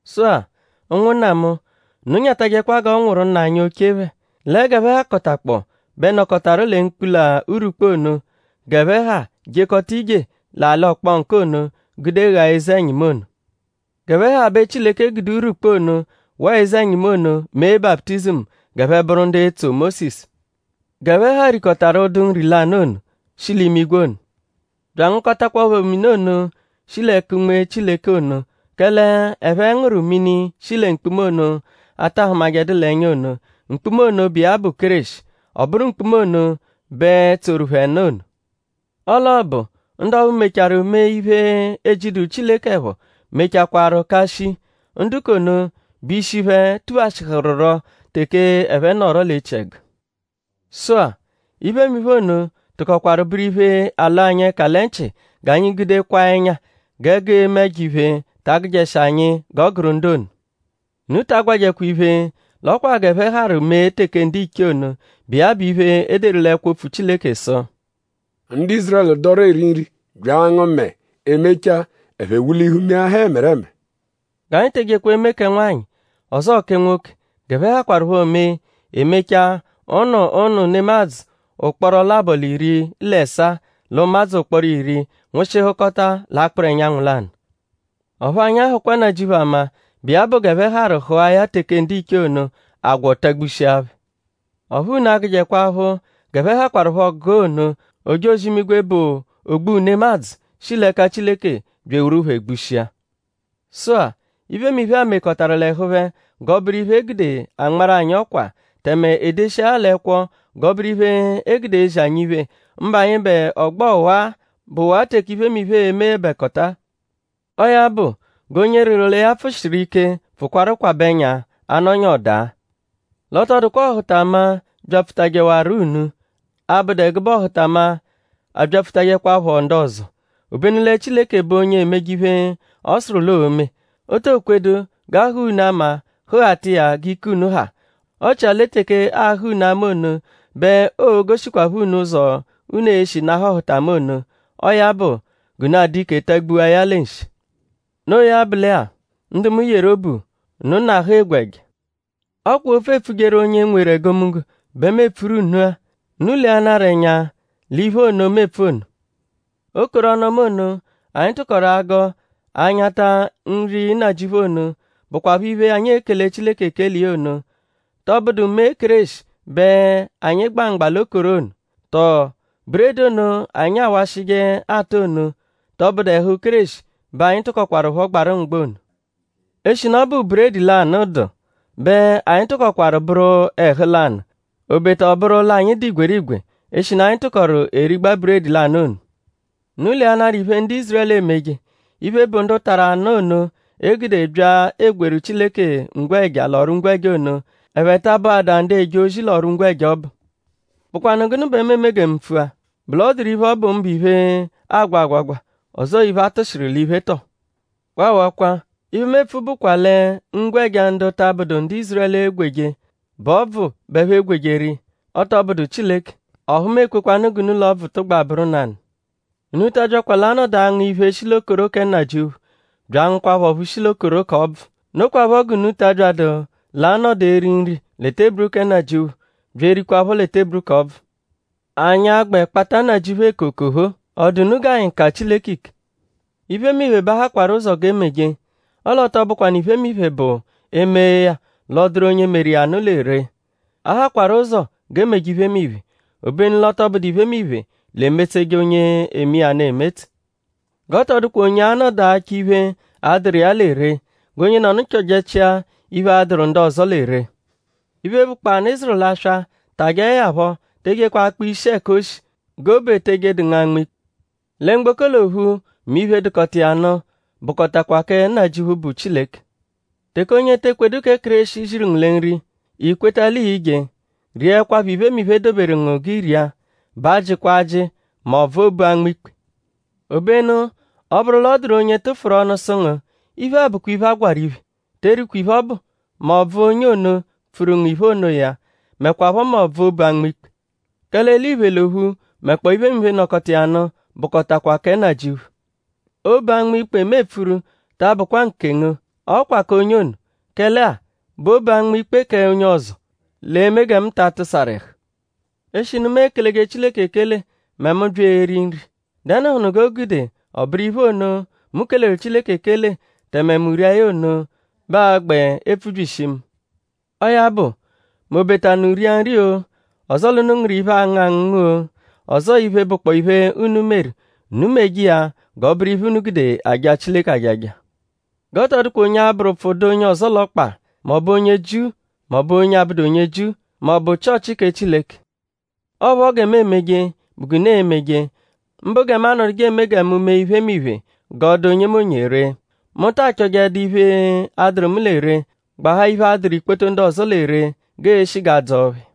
Sụ-a; ụnwunna mu; unu nyatajẹkwa g'ọ nwụru nna anyi oche phẹ. Lẹ g'ẹphe hakọtakpoo bẹ nọkotaru lẹ mkpula urwukpu ono. G'ẹphe ha jekọta ije l'alị ọkponku ono gude ghaa eze mini ono. G'ẹphe ha bẹ Chileke gude urwukpu ono waa eze-ẹnyimu ono mee baputizimu g'ẹphe bụru ndu etso Mósisu. G'ẹphe ha rikọtaru ụdu nri lanụ ono, shi l'imigwe ono bya angụkotakwapho mini ono, shi l'ẹka Unme Chileke ono. Kẹle ẹphe ngụru mini, shi lẹ mkpuma ono, a ta hụmajedu l'ẹnya ono. Mkpuma ono bụ iya bụ Kéreshi. Ọ bụru mkpuma ono bẹ tsoru phẹ nụ ono. Ọo l'ọobu; ndu ọphu mechaarụ mee iphe, ejiduru Chileke ẹpho mechakwaaru ka shii. Ndu k'ono bẹ ishi phẹ tuphashịhururo teke ẹphe nọro l'echiẹgu. Sụ-a; iphemiphe ono tụkokwaru bụru iphe, alọ anyi ẹka lẹ nchị g'anyi gude kwaa ẹnya; g'ẹgu eme ẹjo-iphe ta agụjeshi anyi g'ọ gụru ndu ono. Unu ta agwajẹkwa iphe; l'ọ kwa g'ẹphe harụ mee teke ndiche ono, bụ iya bụ iphe, e deru l'ẹkwo-opfu Chileke sụ: “Ndu Ízurẹlu dọru eri nri; bya angụ mẹe; emechaa ẹphe wulihu meahaa ẹmereme.” G'anyi te ejekwa eme kẹ nwanyị ọzoo kẹ nwoke g'ẹphe hakwarụpho mee; e mechaa ụnu ụnu nemadzụ ụkporo labọ l'iri l'ẹsaa l'ụmadzu ụkporo iri nwụshihukota l'akpụru ẹnyanwu lanụ. Ọphu anyi ahụkwa Nnajịuphu ama, bụ iya bụ g'ẹphe harụ hụa ya teke ndiche ono; agwọ tagbushia phẹ. Ọphu unu agụjekwa aphụ; g'ẹphe hakwarụpho gụa ono; ojozi-imigwe bụ O-gbu-nemadzụ, shi l'ẹka Chileke bya eworu phẹ gbushia. Sụ-a; iphemiphe-a mekọtaru l'ẹhu phẹ g'ọ bụru iphe, e gude anmarụ anyi ọkwa; tẹme e deshia ya l'ẹkwo g'ọ bụru iphe, e gude ezi anyi iphe; mbụ anyịbe ọgbo ọwa-a, bụwaa teke iphemiphe e-meẹbekota-a. Ọo ya bụ; g'onye rịru lẹ ya pfụshiru ike pfụkwaru kwabẹ ẹnya; a -nọnyaa ọ daa! L'ọ tọ dụkwa ọhutama, byapfutajewaru unu, 'abụdu ẹgube ọhutama, abyapfutajẹkwapho ndu ọzo. Obenu lẹ Chileke bụ onye emeje iphe, ọ sụru l'oo-me. O to kwedu g'a hụa unu ama hụghata iya g'ike unu ha; ọ chia lẹ teke aahụ unu ama ono bẹ oo-goshikwaphọ unu ụzo, unu e-shi nahụ ọhutama ono. Ọo ya bụ g'unu adụ ike tagbua ya lẹ nshi. Noo ya bụ lẹ-a; ndu mu yeru obu; unu nahụ egwe ẹja. Ọ kwa opfu, eepfujeru onye nweru egomunggo bẹ mu epfuru unu-a. Unu leanarọ ẹnya l'iphe ono, mu epfu ono. Okoro ọnu-ọma ono, anyi tụkoru agọ anyata nri Nnajịuphu ono, bụkwapho iphe, anyi ekele Chileke ekele iya ono;?tọ bụdu mee Kéreshi bẹ anyi gba mgba l'okoro ono? Tọo; buredi ono, anyi awashịje ata ono;?tọ bụdu ẹhu Kéreshi bẹ anyi tụkokwarupho gbarụ mgba ono? Eshinu ọ bụ buredi lanụ dụ bẹ anyi tụkokwaru bụru ẹhu lanụ; obeta ọ bụru l'anyi dụ igwerigwe; eshinu anyi tụkoru erigba buredi lanụ ono. Unu leanarọ iphe, ndu Ízurẹlu emeje. Iphe, bụ ndu tarụ anụ ono, e gude bya egweeru Chileke ngwẹja l'ọru-ngwẹja ono;?ẹphe ta abụada ndu eje ozi l'ọru-ngwẹja ọbu? ?Bụkwanu gụnu bẹ mu eme gẹ mu pfua??Bụ l'ọ dụru iphe, ọbu mbụ iphe, aagwa agwagwa; ọzoo iphe, a tụshiru l'iphe tọo? Waawakwa! Iphe, mu epfu bụkwa lẹ ngwẹja, ndu ta abụdu ndu Ízurẹlu egweje bụ ọbvu bẹ ẹphe egweru iya. Ọ tọ bụdu Chileke. Ọphu mu ekwekwanụ g'unu l'ọbvu tụgba bụru nanụ. Unu ta abyakwa l'a-nọdu angụ iphe, shi l'okoro kẹ Nnajịuphu bya angụkwapho ọphu shi l'okoro k'ọbvu. Nokwaphọ g'unu ta abyadụ l'a-nọdu eri nri lẹ teburu kẹ Nnajịuphu bya erikwaphọ lẹ teburu k'ọbvu. ?Anyi agbẹ kpata Nnajịuphu eko okophoo??Ọ dụ unu g'anyi ka Chileke ike? Iphemiphe bẹ a hakwaru ụzo g'e meje; ọle ọ tọ bụkwanu iphemiphe bụ e -mee ya l'ọ dụru onye meru iya nụ lẹ ree. A hakwaru ụzo g'e meje iphemiphe; obenu l'ọ tọ bụdu iphemiphe l'emetseje onye eme iya nụ emetse. G'ọ tọ dụkwa onye anọdu achọ iphe, a-dụru iya lẹ ree. G'onyenọnu chọjechia iphe, a-dụru ndu ọzo lẹ ree. Iphe, bụkpoo anụ, ị zụru l'aswa; tajẹe ya phọ; te ejekwa akpa ishi ẹka o shi; g'obu etee jedu ngu anma ikpe. “Lẹ mgboko l'ophu; mẹ iphe dụkota iya nụ; bụkotakwa kẹ Nnajịuphu, bụ Chileke.” Teke onye te ekwedu kẹ Kéreshi ziru ngu lẹ nri; i kweta l'ii-je; riẹkwapho iphemiphe, e doberu ngu g'i ria. B'ajịkwa ajị; m'ọbvu obu anma ikpe. Obenu ọ -bụru l'ọ dụru onye tụfuru ọnu sụ ngu: “Iphe-a bụkwa iphe, a gwarụ iphe”; te erikwa iphe ọbu; m'ọbvu onye ono, pfuru ngu iphe onoya; mẹkwapho m'ọbvu obu anma ikpe. “Kẹle eliphe l'ophu mẹkpoo iphemiphe, nọkota iya nụ bụkotakwa kẹ Nnajịuphu.” Obu anma ikpe mu epfuru ta abụkwa nkengu; ọ kwa k'onye ono. Kẹle-a;?bụ obu anma ikpe k'onye ọzo; l'e-me gẹ mu ta atụsaru ẹhu? Eshinu mu ekeleje Chileke ekele mẹ mu -bya eri nri;?dẹnuhunu g'o gude ọ bụru iphe ono, mu keleru Chileke ekele tẹme mu rije iya ono bẹ aa-gbẹ epfubyishi mu. Ọo ya bụ; m'obeta unu ria nri-o; ọzoo l'unu ngụru iphe, aangụ angụngu-o; ọzoo iphe, bụkpoo iphe, unu meru; unu meje iya g'ọ bụru iphe, unu gude aja Chileke ajaja. G'ọ tọ dụkwa onye abụru ụpfu dụ onye ọzo l'ọkpa; m'ọ bụ onye Jiu; m'ọ bụ onye abụdu onye Jiu; m'ọ bụ Chịochi kẹ Chileke. Ọo phọ gẹ mu emeje bụ g'unu e-meje; mbụ gẹ mu anọduje eme gẹ mu mee iphemiphe g'ọ dụ onyemonye ree. Mu ta achọjedu iphe, a-dụru mu lẹ ree; gbahaa iphe, a-dụru ikpoto ndu ọzo lẹ ree g'eeshi g'a dzọo phẹ.